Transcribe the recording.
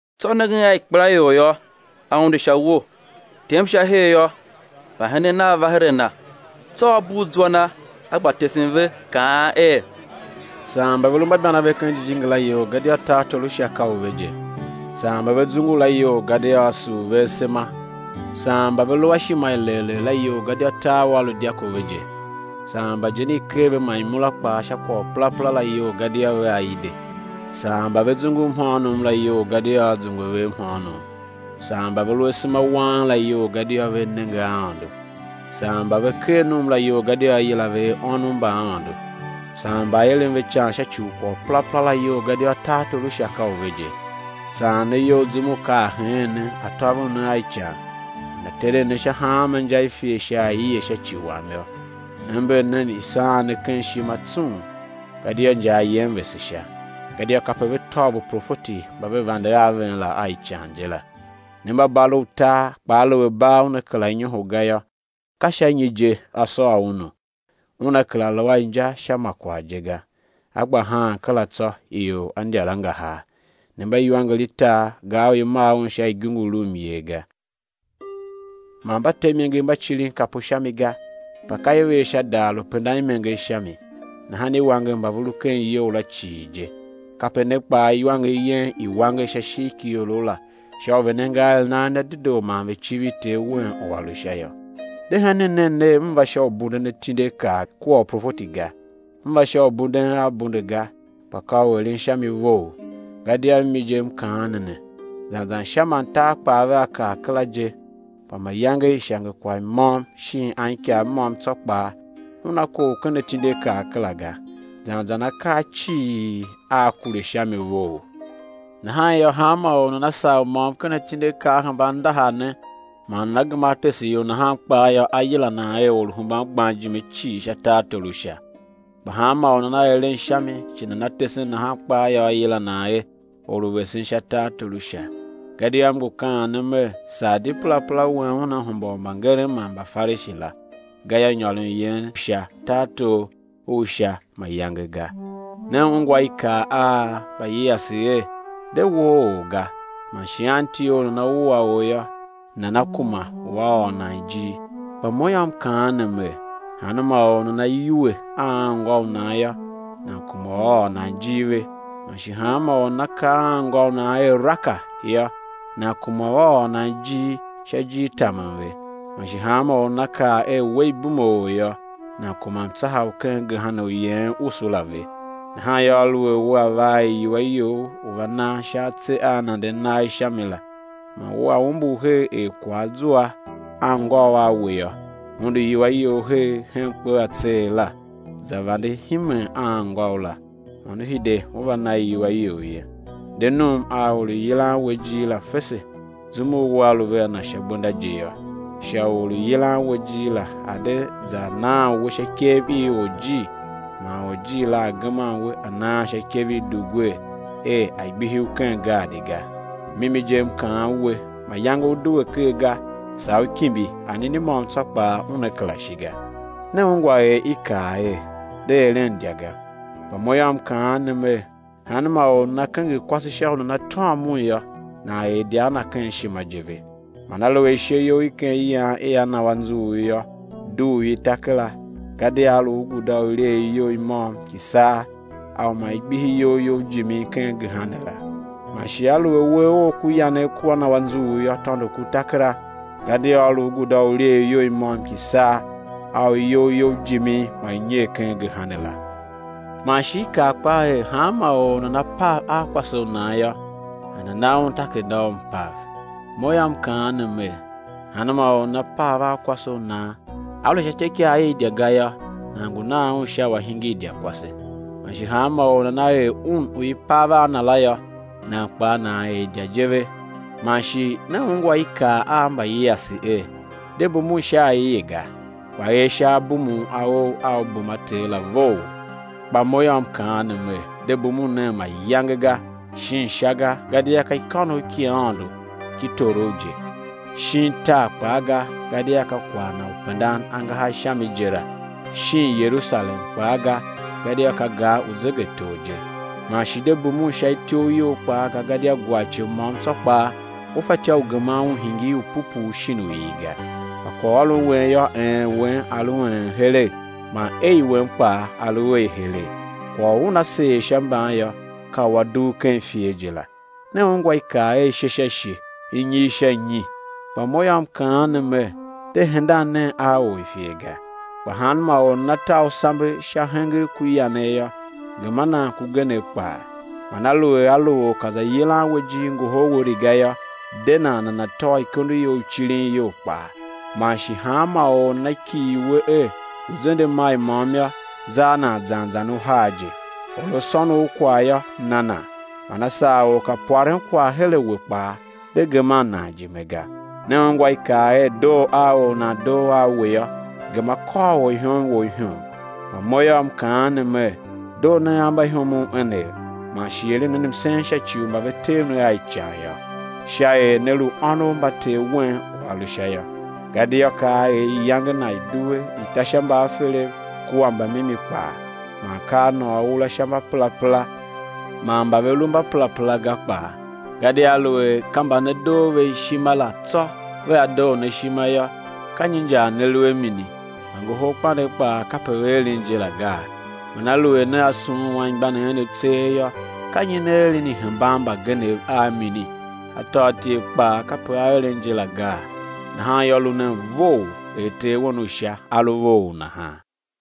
Tsô nengen a ikpelaior yô, A unde sha uwo; tem sha her yô, mbahenen Nav va her a Na. Tsô A bugh zwa Na, A gba tesen ve, kaan er: Saan mba ve lu mbaibanave ken jijingi la iyol, gadia tartor u Sha ka u ve je. Saan mba ve zungu la iyol, gadia á sur ve asema. Saan mba ve lu a ishima i legh legh la iyol, gadia tar ua lu dyako ve je. Saan mba ijen i ker ve, man imura kpaa, sha kwagh u perapera la iyol, gadia vea ide. Saan mba ve zungu mhôônom la iyol, gadia á zungwe ve mhôônom. Saan mba ve lu asema wang la iyol, gadia vea nenge a Aôndo. Saan mba ve ker num la iyol, gadia á yila ve er, ônov mba Aôndo. Saan mba i eren ve ican sha ci u kwagh u perapera la iyol, gadia tartor u Sha ka u ve je. Saan ne iyol zum u ka a heen ne, a tôvon ne a ican, man a teren ne sha hanma inja i ifer sha aie, sha ci Wam yô, ember nen, i̱ saan ne ken ishima tsung, gadia injar yen vese Sha, gadia kape ve tôv uprofeti mba ve vande a ven la a ican je la. Ne mba bar u tar; kpa aluer bar una kera nyoho ga yô, ka sha nyi je á sôr unu? Una kera lu a inja sha ma kwagh je ga, á gba haan kera tsô, ior á ndyar angahar. Ne mba iwanger i tar. Gar u i maa un sha igungu, lu myer ga. Man mba te imenger mba cirin kapu sha mi ga, kpa ka i ver sha daar u pendan imenger sha mi, nahan i wanger mba ve lu ken iyou la cii je. Kape ne kpaa iwanger yen i̱ wanger sha ishigh ki iorough la, sha u ve̱ nenge aeren a en a dedoo man ve̱ civir Ter wen u A lu Sha yô. De henen nen ner, M va sha u bunden atindiakaa kua uprofeti ga, M va sha u bunden a bunde ga, kpa ka u eren sha mi vough. Gadia mimi je M kaan ne ne, zan zan Sha man tar kpaa vea kar kera je, kpa mayange ishangekwagh môm shin anikav môm tsô kpaa una kough ken atindiakaa kera ga, zan zan akaa cii aa kure sha mi vough. Nahan yô, hanma or u nana sagh u môm ken atindiakaa a hemban ndahar ne man nana gema á tese ior nahan kpaa yô, á yila nan er or u hemban gban ijime cii sha tartor u Sha; kpa hanmô u nana eren sha mi, shi nana tesen nahan kpaa yô, á yila nan er or u vesen sha tartor u Sha. Gadia M ngu kaan ne Mer, saa di perapera wen una hemba u mbangeren man Mbafarishi la, gayô, nyôron yen sha tartor u Sha mayange ga. Ne ungwa i kaa a mbayiase er: De woo or ga, man anti or u nana wua or yô, nana kuma u á ôr nan ijir. Kpa Mo yô, M kaan ne Mer: Hanma or u nana yuwe a anngô u nan yô, nan kuma u á ôr nan ijir ve; man shi hanma or u nana kaa a anngô u nan er, Raka, yô, nan kuma u á ôr nan ijir sha ijirtamen ve; man shi hanma or u nana kaa er, we, ibumeor, yô, nan kuma mtsaha u ken gehena u yeghen usu la ve. Nahan yô, aluer wea va a iwua you u va nan sha atse a nanden nagh sha mi la, man wea umbur her er kwagh a zua anngôu a we yô, undu iwua you her hen kpe atseegh la, za vande himen a anngôu la, man ú hide, ú va na iwua you ye. De num a or u yilan we ijir la fese, zum u wea lu vea na sha gbenda je yô; sha u or u yilan we ijir la a̱ de za naan we sha ikev i orjir man orjir la a̱ geman we a̱ naan sha ikev i dugwer er a̱ gbihi u ken gaadi ga. Mimi je M kaan we, mayange ú due ker ga, saa ú kimbi, anini môm tsô kpaa una kera shi ga. Ne ungwa er i kaa er: De eren idya ga. Kpa Mo yô, M kaan ne ner hanma or u nana kenger kwase sha u nana tôm un yô, nan er idya a na ken ishima je ve. Man aluer ishe you i ken iyan ia na u anzughul yô, dugh i, ta kera; gadia á lu u guda u ilyeegh you i môm ki saa a u ma i gbihi iyol you jimin ken gehena la. Man shi aluer uwegh ough ku yanegh kua na u anzughul yô, tôndo ku, ta kera, gadia á lu u guda u ilyeegh you i môm ki saa, a u iyol you jimin ma i nyer ken gehena la. Man shi i kaa kpaa er, hanma or u nana pav a kwase u nan yô, nana̱ na un takerada u mpav. Mo yô, M kaan ne Mer: Hanma or u nana pav a kwase u nan, á lu sha ityôikaa i idya ga yô, nan ngu nan un sha u a̱ hingir idyakwase; man shi hanma or u nana er un u i pav a na la yô, nan kpaa nan er idya je ve. Man shi ne ungwa i kaa a mbayiase er: De bumun sha aie ga, kpa er sha abumun a ou a u bum a Ter la vough. Kpa Mo yô, M kaan ne Mer: De bumun nen mayange ga: shin Sha ga, gadia ka ikônough ki Aôndo ki torough je; shin tar kpaa ga, gadia ka kwagh Na u pendan angahar sha mi je la; shin Yerusalem kpaa ga, gadia ka gar u Zegetor je; man shi de bumun sha ityough you kpaa ga, gadia gwarce môm tsô kpaa u fatyô u geman un hingir u pupuu shin u il ga. Kpa kwaghôron wen yô, “Een” wen a̱ lu “een” heregh, man “ei” wen kpaa, a̱ lu “ei” heregh. Kwagh u una seer sha mban yô, ka u a dugh ken ifer je la. Ne ungwa i kaa er: Ishe sha ishe, inyigh sha inyi; kpa Mo yô, M kaan ne Mer: De hendan nen a or u ifer ga; kpa hanma or u nana ta u sambe sha hengegh ku yanegh yô, gema nan kugenegh kpaa. Man aluer a lu or ka za yilan we ijir ngohol we riga yô, de nan nana̱ tôô ikondo you i cirin iyol kpaa. Man shi hanma or u nana kighir we er u̱ zende mail môm yô, za a nan zan zan uhar je. Or a sôn u kwagh yô, na nan, man a sar or ka pwaren kwagh her a we kpaa, de geman nan ijime ga. Ne ungwa i kaa er: Doo a or u nan we ndor a we yô, gema kôr orihom wou ihom. Kpa Mo yô, M kaan ne Mer: Doo nen a mbaihomov enev, man shi eren nen msen sha ci u mba ve tev ne a ican yô; sha er né lu ônov mba Ter wen u A lu Sha yô, gadia ka A er iyange Na i̱ due i̱ ta sha mbaaferev kua mbamimi kpaa, man ka A nôô ura sha mbaperapera man mba ve lu mba perapera ga kpaa. Gadia aluer ka mba ne doo ve ishima la tsô vea doo ne ishima yô, ka nyi injar ne lu a mini? Mbangoholkpandegh kpaa kape ve eren je la gaa? Man aluer nea sughun anmgbianev enev tseegh yô, ka nyi ne eren i hemban mbagenev a mini? Atôatyev kpaa kape a eren je la gaa? Nahan yô, lu nen vough er Ter wen u Sha A lu vough nahan.